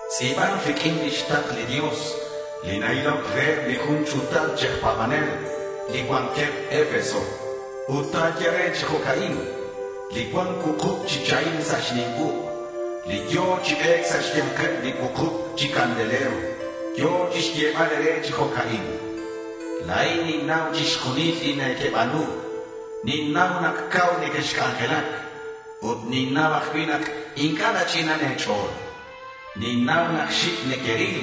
Tz'i̱ban riq'uin lix takl li Dios li na-iloc reheb li jun ch'u̱tal chi aj pa̱banel li cuanqueb Efeso ut ta̱ye re chi jo'ca'in: —Li cuan cuukub chi chahim sa' xnim uk', li yo̱ chi be̱c sa' xya̱nkeb li cuukub chi candelero yo̱ chixyebal e̱re chi jo'ca'in: La̱in ninnau chixjunil li nequeba̱nu. Ninnau nak cau nequexc'anjelac ut ninnau ajcui' nak inc'a' nach'inan e̱ch'o̱l. Ninnau nak xic' nequeril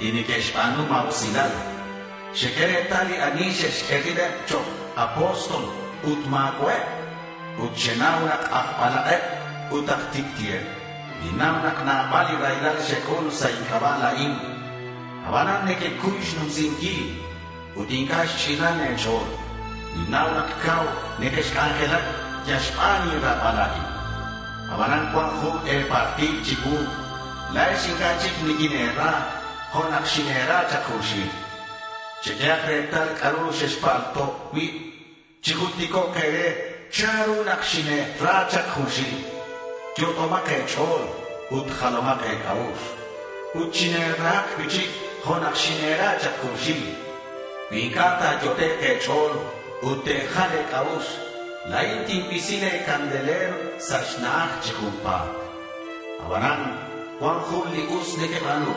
li neque'xba̱nu ma̱usilal. Xeq'ue retal li ani xe'xq'ue ribeb chok' apóstol ut ma̱cua'eb. Ut xenau nak aj balak'eb ut aj tic'ti'eb. Ninnau nak nabal li raylal xec'ul sa' inc'aba' la̱in. Abanan nequecuy xnumsinquil. Ut inc'a' xch'inan e̱ch'o̱l. Ninnau nak cau nequexc'anjelac yal xban inra̱bal la̱in. Abanan cuan jun e̱paltil chicuu. La̱ex inc'a' chic niquine̱ra jo' nak xine̱ra chak junxil. Cheq'uehak retal c'a'ru xexpalto' cui'. Chijulticok' e̱re chanru nak xine̱ra chak junxil. Yot'omak e̱ch'o̱l ut jalomak e̱c'a'ux ut chine̱rahak cui'chic jo' nak xine̱ra chak junxil. Cui inc'a' ta̱yot'ek' e̱ch'o̱l ut te̱jal e̱c'a'ux, la̱in tincuisi le̱ candelero sa' xna'aj chi junpa̱t. Abanan cuan jun li us nequeba̱nu.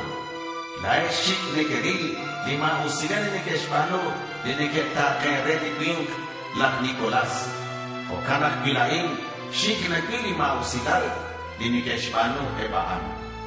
La̱ex xic' nequeril li ma̱usilal li neque'xba̱nu li neque'ta̱ken re li cui̱nk laj Nicolás. Jo'can ajcui' la̱in. Xic' nacuil li ma̱usilal li neque'xba̱nu eb a'an.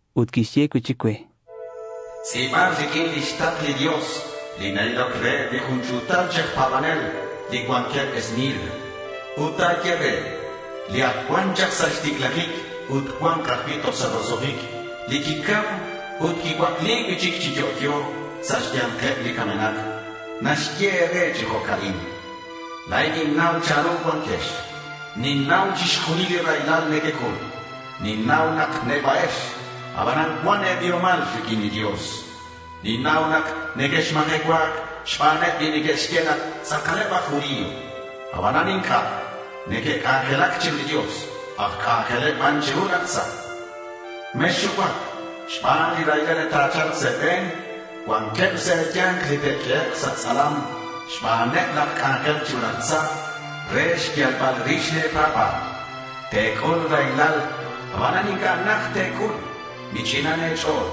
Ut quixye cui'chic cue: —Tz'i̱ban riq'uin lix takl li Dios, li na-iloc reheb li jun ch'u̱tal chi aj pa̱banel li cuanqueb Esmirna. Ut ta̱ye re: Li ac cuan chak sa' xticlajic ut cua̱nk ajcui' toj sa' roso'jic, li quicam ut quicuacli cui'chic chi yo'yo sa' xya̱nkeb li camenak, naxye e̱re chi jo'ca'in: La̱in ninnau chanru cuanquex. Ninnau chixjunil li raylal nequec'ul. Ninnau nak neba'ex. Abanan cuan e̱biomal riq'uin li Dios. Ninnau nak nequexmajecua̱c xbaneb li neque'xye nak tz'akaleb aj judío, abanan inc'a' neque'c'anjelac chiru li Dios. Aj c'anjeleb ban chiru laj tza. Mexxucuac xban li raylal li ta̱cha̱lk sa' e̱be̱n. Cuanqueb sa' e̱ya̱nk li te'q'uehek' sa' tz'alam xbaneb laj c'anjel chiru laj tza re xyalbal rix le̱ pa̱ba̱l. Te̱c'ul raylal, abanan inc'a' najt te̱c'ul. Mich'inan e̱ch'o̱l.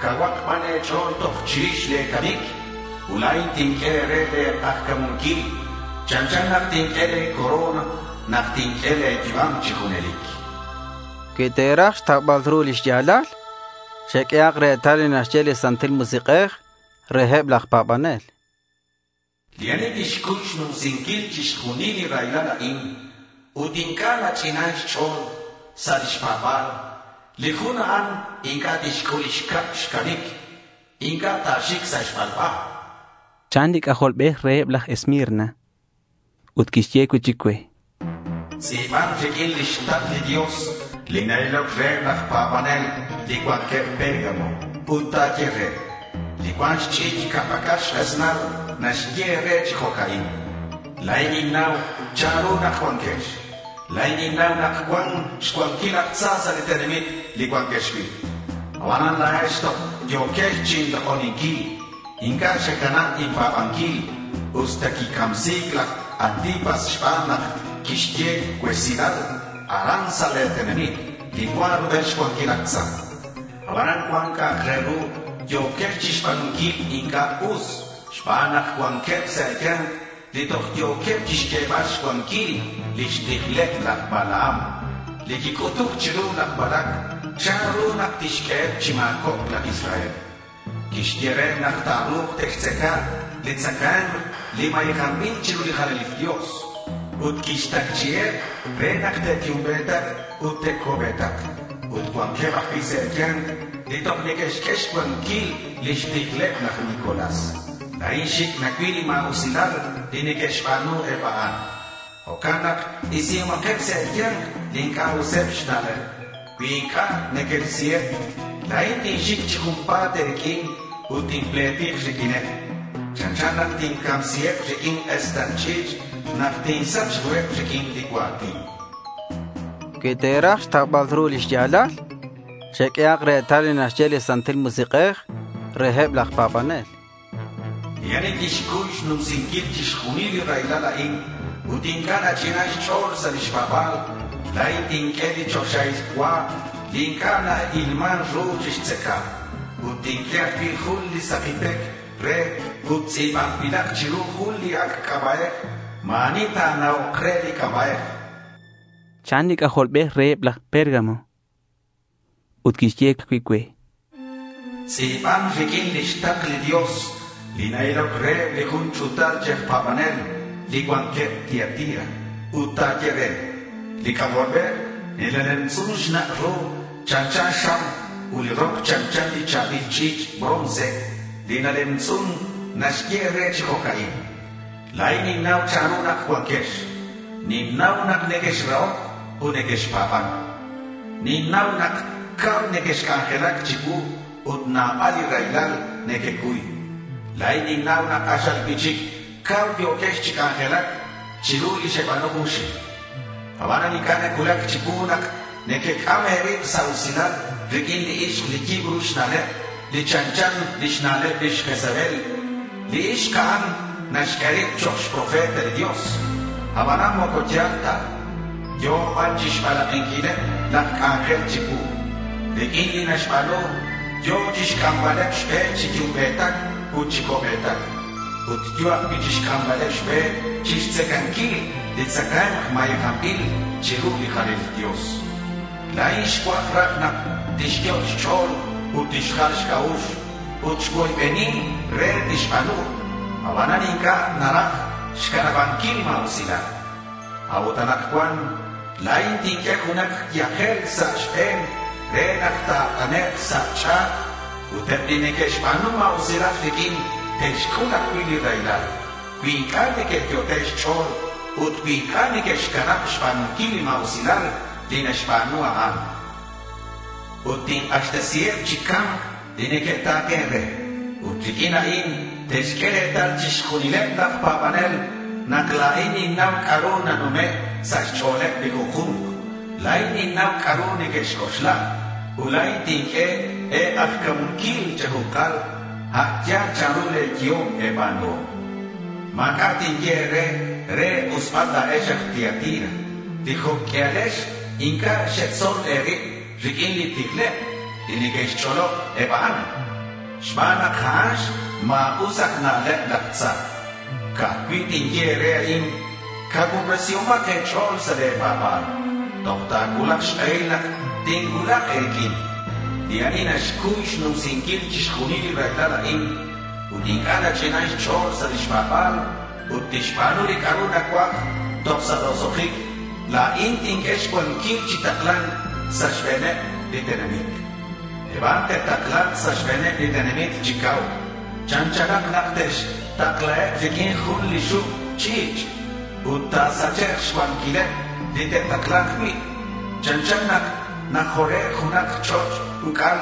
Cauhak ban e̱ch'o̱l toj chirix le̱ camic ut la̱in tinq'ue e̱re le̱ k'ajca̱munquil. Chanchan nak tinq'ue le̱ corona nak tinq'ue le̱ yu'am chi junelic. Cui te̱raj xtaubal ru li xya̱lal, cheq'uehak retal li naxye li Santil Musik'ej reheb laj pa̱banel. Li ani tixcuy xnumsinquil chixjunil li raylal a'in ut inc'a' nach'inan xch'o̱l sa' lix pa̱ba̱l, li jun a'an inc'a' tixc'ul lix cab xcamic. Inc'a' ta̱xic sa' xbalba, chan li C'ajolbej reheb laj Esmirna. Ut quixye cui'chic cue: —Tz'i̱ban riq'uin lix takl li Dios li na-iloc reheb laj pa̱banel li cuanqueb Pérgamo ut ta̱ye re: Li cuan xch'i̱ch' ca' pac'al xk'esnal naxye e̱re chi jo'ca'in: La̱in ninnau chanru nak cuanquex. La̱in ninnau nak cuan xcuanquil laj tza sa' li tenamit li cuanquex cui'. Abanan la̱ex toj yo̱quex chinlok'oninquil. Inc'a' xecanab inpa̱banquil usta quicamsi̱c laj Antipas xban nak quixye cuesilal aran sa' le̱ tenamit li cuan rubel xcuanquil laj tza. Abanan cuan c'a'ak re ru yo̱quex chixba̱nunquil inc'a' us xban nak cuanqueb sa' e̱ya̱nk li toj yo̱queb chixq'uebal xcuanquil lix tijleb laj Balaam li quic'utuc chiru laj Balac chanru nak tixq'ueheb chi ma̱cobc laj Israel. Quixye reheb nak ta̱ru̱k te'xtzaca li tzacae̱mk li mayejanbil chiru li jalanil dios. Ut quixtacchi'iheb re nak te'yumbe̱tak ut te'co'be̱tak. Ut cuanqueb ajcui' sa' e̱ya̱nk li toj neque'xq'ue xcuanquil lix tijleb laj Nicolás. La̱in xic' nacuil li ma̱usilal li neque'xba̱nu eb a'an. Jo'can nak isihomakeb sa' e̱ya̱nk li inc'a' useb xna'leb. Cui inc'a' nequerisiheb, la̱in tinxic chi junpa̱t e̱riq'uin ut tinpletik riq'uineb. Chanchan nak tincamsiheb riq'uin k'esnal ch'i̱ch' nak tinsach ruheb riq'uin li cua̱tin. Cui te̱raj xtaubal ru li xya̱lal, cheq'uehak retal li naxye li Santil Musik'ej reheb laj pa̱banel. Li ani tixcuy xnumsinquil chixjunil li raylal a'in ut inc'a' nach'inan xch'o̱l sa' lix pa̱ba̱l, la̱in tinq'ue li choxahil cua li inc'a' na-ilman ru chixtzaca. Ut tinq'ue ajcui' jun li saki pec re ut tz'i̱banbilak chiru jun li ac' c'aba'ej. Ma̱ ani ta̱na'ok re li c'aba'ej. Ca'aj cui' li ani li ta̱c'uluk re, chan li C'ajolbej reheb laj Pérgamo. Ut quixye ajcui' cue: —Tz'i̱ban riq'uin lix takl li Dios li na-iloc reheb li jun ch'u̱tal chi aj pa̱banel li cuanqueb Tiatira ut ta̱ye re: Li C'ajolbej, li nalemtz'un xnak' ru chanchan xam ut li rok chanchan li cha̱bil ch'i̱ch' bronce li nalemtz'un, naxye e̱re chi jo'ca'in: La̱in ninnau chanru nak cuanquex. Ninnau nak nequexrahoc ut nequexpa̱ban. Ninnau nak cau nequexc'anjelac chicuu ut nabal li raylal nequecuy. La̱in ninnau nak k'axal cui'chic cau yo̱quex chi c'anjelac chiru li xeba̱nu junxil. Abanan inc'a' nacuulac chicuu nak nequec'am e̱rib sa' usilal riq'uin li ixk li yibru xna'leb li chanchan lix na'leb lix Jezabel. Li ixk a'an naxq'ue rib chok' xprofeta li Dios, abanan moco ya̱l ta. Yo̱ ban chixbalak'inquileb laj c'anjel chicuu. Riq'uin li naxba̱nu yo̱ chixc'ambaleb xbe chi yumbe̱tac ut chi co'be̱tac. Ut yo̱ ajcui' chixc'ambaleb xbe chixtzacanquil li tzacae̱mk mayejanbil chiru li jalanil Dios. La̱in xcuaj raj nak tixyot' xch'o̱l ut tixjal xc'a'ux ut xcuoybeni re tixba̱nu. Abanan inc'a' naraj xcanabanquil li ma̱usilal. A'ut anakcuan la̱in tinq'ue junak yajel sa' xbe̱n re nak ta̱t'anek' sa' ch'a̱t. Ut eb li neque'xba̱nu ma̱usilal riq'uin te'xc'ul ajcui' li raylal cui inc'a' neque'yot'e' xch'o̱l ut cui inc'a' neque'xcanab xba̱nunquil li ma̱usilal li naxba̱nu a'an. Ut tink'axtesiheb chi ca̱mc li neque'ta̱ken re. Ut riq'uin a'in te'xq'ue retal chixjunileb laj pa̱banel nak la̱in ninnau c'a'ru nanume' sa' xch'o̱leb li junju̱nk. La̱in ninnau c'a'ru nequec'oxla. Ut la̱in tinq'ue e̱k'ajca̱munquil che̱ju̱nkal a' yal chanru le̱ yehom e̱ba̱nuhom. Ma̱c'a' tinye e̱re re e̱k'usbal la̱ex aj Tiatira li jo' q'uialex inc'a' xetzol e̱rib riq'uin li tijleb li neque'xch'olob eb a'an, xban nak a'an xma̱us aj na'leb laj tza. Ca'aj cui' tinye e̱re a'in: Cacuubresihomak e̱ch'o̱l sa' le̱ pa̱ba̱l toj ta̱cuulak xk'ehil nak tincuulak e̱riq'uin. Li ani naxcuy xnumsinquil chixjunil li raylal a'in ut inc'a' nach'inan xch'o̱l sa' lix pa̱ba̱l ut tixba̱nu li c'a'ru nacuaj toj sa' roso'jic, la̱in tinq'ue xcuanquil chi takla̱nc sa' xbe̱neb li tenamit. Eb a'an te'takla̱nk sa' xbe̱neb li tenamit chi cau. Chanchan nak te'xtaklaheb riq'uin jun li xuk' ch'i̱ch'. Ut ta̱sachek' xcuanquileb li te'takla̱nk cui'. Chanchan nak najore' junak ch'och' uc'al.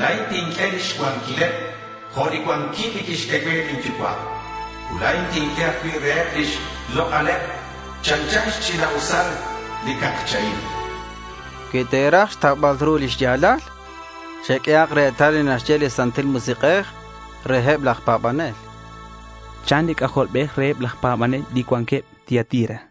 La̱in tinq'ue lix cuanquileb jo' li cuanquil li quixq'ue cue lin Yucua'. Ut la̱in tinq'ue ajcui' reheb lix lok'aleb, chanchan xch'ina'usal li cak chahim. Cui te̱raj xtaubal ru li xya̱lal, cheq'uehak retal li naxye li Santil Musik'ej reheb laj pa̱banel, chan li C'ajolbej reheb laj pa̱banel li cuanqueb Tiatira.